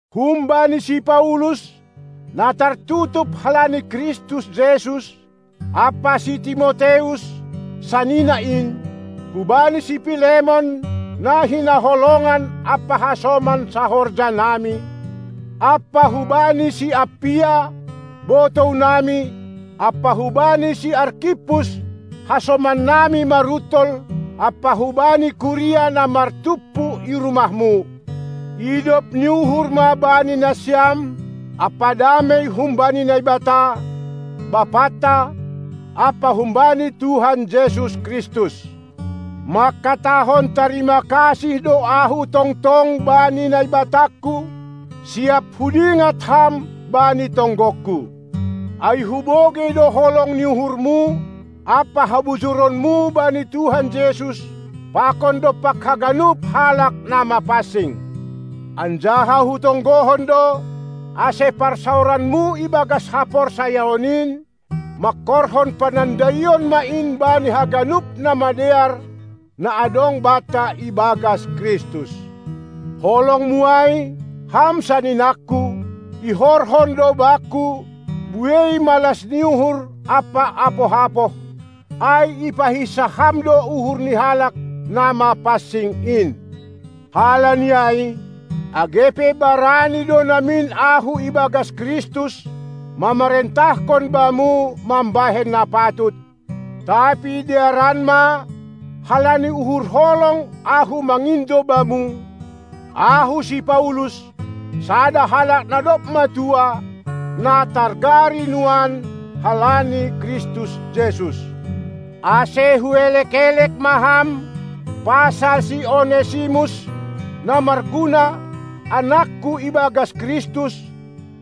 Humbani si Paulus, na tartutup halani Kristus Jesus, ampa si Timoteus, sanina in, hubani si Pilemon, na hinaholongan ampa hasoman sahorjanami, ampa hubani si Appia, botounami, ampa hubani si Arkippus, hasomannami maruntol, ampa hubani kuria na martumpu i rumahmu: Idop ni uhur ma bani nasiam ampa damei humbani Naibata, Bapanta, ampa humbani Tuhan Jesus Kristus. Mangkatahon tarima kasih do ahu tongtong bani Naibatangku, siap hudingat ham bani tonggongku. Ai hubogei do holong ni uhurmu ampa habujuronmu bani Tuhan Jesus pakon dompak haganup halak na mapansing. Anjaha hutonggohon do, ase parsaoranmu ibagas haporsayaon in mangkorhon panandaion ma in bani haganup na madear na adong banta ibagas Kristus. Holongmu ai, ham saninangku, ihorhon do bakku buei malas ni uhur ampa apoh-apoh, ai ipahinsah ham do uhur ni halak na mapansing in. Halani ai, age pe barani do namin ahu ibagas Kristus, mamarentahkon bamu mambahen na patut, tapi dearan ma halani uhur holong ahu mangindo bamu, ahu, si Paulus, sada halak na dob matua, na targari nuan halani Kristus Jesus. Ase huelek-elek ma ham pasal si Onesimus (na marguna), anakku ibagas Kristus,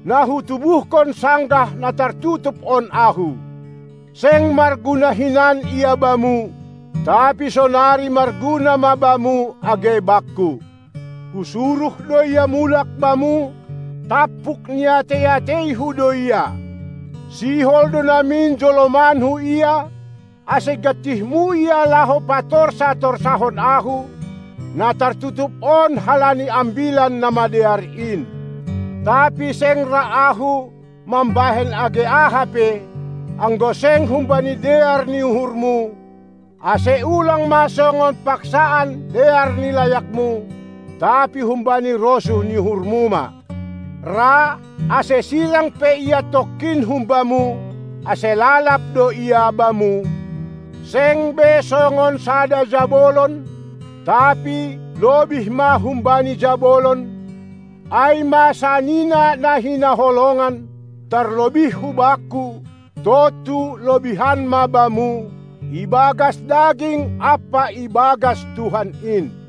na hutubuhkon sanggah na tartutup on ahu. Seng marguna hinan ia bamu, tapi sonari marguna ma bamu age bakku. Husuruh do ia mulak bamu, tampuk ni atei-ateihu do ia. Sihol do namin jolomanku ia, ase gantihmu ia laho patorsa-torsahon ahu, na tartutup on halani Ambilan Namadear in. Tapi seng ra ahu mambahen age aha pe, anggo seng humbani dear ni uhurmu, ase ulang ma songon paksaan dear ni layakmu, tapi humbani rosuh ni uhurmu ma. Ra, ase sirang pe ia tongkin humbamu, ase lalab do ia bamu, seng be songon sada jabolon, tapi lobih ma humbani jabolon, ai ma sanina na hinaholongan, tarlobih hubakku, tontu lobihan ma bamu, ibagas daging ampa ibagas Tuhan in.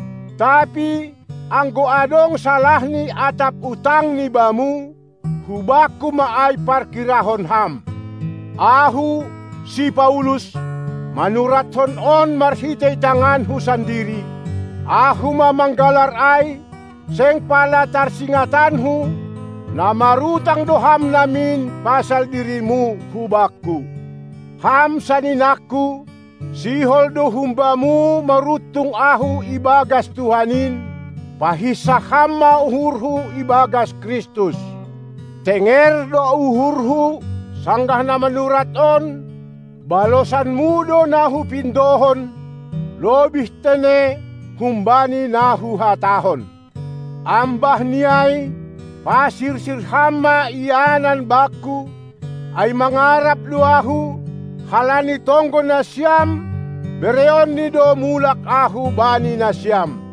Tapi, anggo adong salahni atap utangni bamu, hubakku ma ai parkirahon ham. Ahu, si Paulus, manuratkon on marhitei tanganku sandiri: Ahu ma manggalar ai; seng pala tarsingatanku, na marutang do ham namin pasal dirimu hubakku. Ham saninangku, sihol do humbamu maruntung ahu ibagas Tuhan in; pahinsah ham ma uhurhu ibagas Kristus. Tenger do uhurhu, sanggah na manurat on, balosanmu do na hupindohon, lobih tene humbani na huhatahon. Ambah ni ai pasirsir ham ma ianan bakku, ai mangarap do ahu, halani tonggo nasiam bereonNi do mulak ahu bani nasiam.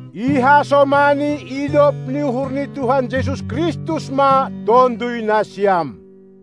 Ihasomani idop ni uhur ni Tuhan Jesus Kristus ma tonduy nasiam.